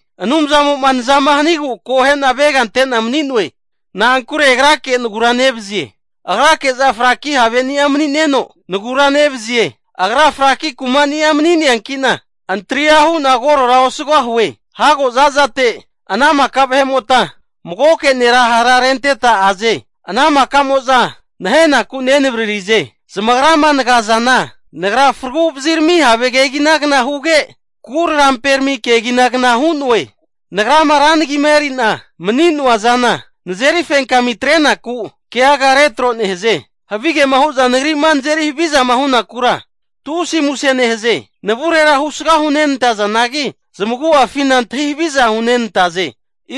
Anumzamo'ma nazama hanigu akohe'na avegante'na mani'noe. Na'ankure Agrake nagura nevazie. Agrake'za fraki haveni'a mani'neno, nagura nevazie. Agra fraki kumani'a mani'neankina, antria hu'na korora osugahue. Hago zazate ana maka vahe'mota magoke nera hara renteta aze. Ana maka'moza nahenaku nenavararize. Zamagrama nagazana nagra fraguvazirami have keginagna huge, kuraramperami keginagna hu'noe. Nagrama ra nagima eri'na mani'noa zana, nazeri fenkami atrenaku, keaga retro nehaze. Havigema hu'za nagri'ma nazeri havizama hu'nakura tusi muse nehaze. Navurera husga hunenantazanagi, zamagu'afina antahi haviza hunenantaze.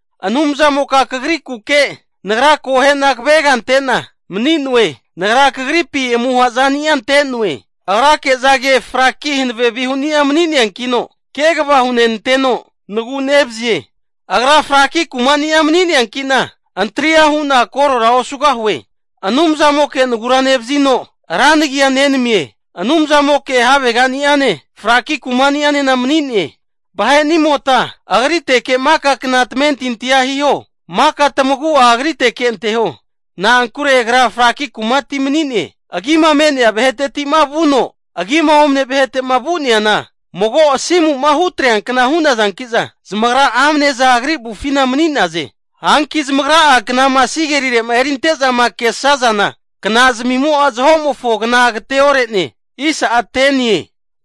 Anumzamoka Kagrikuke nagra akohe'na kavega ante'na mani'noe. Nagra Kagripi amuha zani'a ante'noe. Agrake'zage framaki hanave havenia mani'neankino, kegava hunenanteno nagu'nevazie. Agra fraki kumani'a mani'neankina, antria hu'na korora osugahue. Anumzamoke nagura nevazino, ra nagia nenamie. Anumzamoke havegani'ane, fraki kumani'anena mani'ne. Vahe'nimota Agriteke maka kna tamentintia hiho. Maka tamagu'a Agriteke anteho, na'ankure Agra fraki kumati mani'ne. Agima me'nea vahetetima vuno agima omane vahetema vu'neana, mago asimu'ma hutreankna hu'nazankiza, zamagra amne'za Agri avufina mani'naze. Hanki zamagra'a knama sigelire'ma erinte'zama kesazana, knazmimo'a zahomofo kna'a agateore'ne.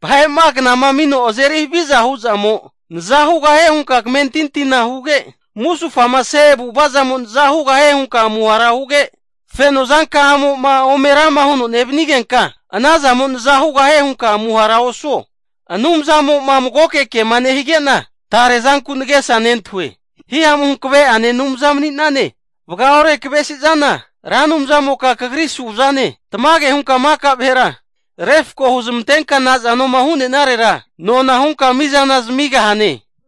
Vahe'ma knama amino azeri havizama hu'zamo naza hugahie hunka kamentintina huge, musufamase avu'avazamo naza hugahie hunka amuhara huge, fenozanka'amo'ma ome rama huno nevanigenka, ana zamo'a naza hugahie hunka amuhara osuo. Anumzamo'ma magoke kema nehige'na, tare zanku nagesa nentahue. Hihamu hankaveane Anumza mani'nane. Vagaore kavesizana, Ra Anumzamoka Kagri suzane. Tamage hunka maka vahera refko huzmantenka nazanoma hu'nenarera nona hunka mizana zamigahane.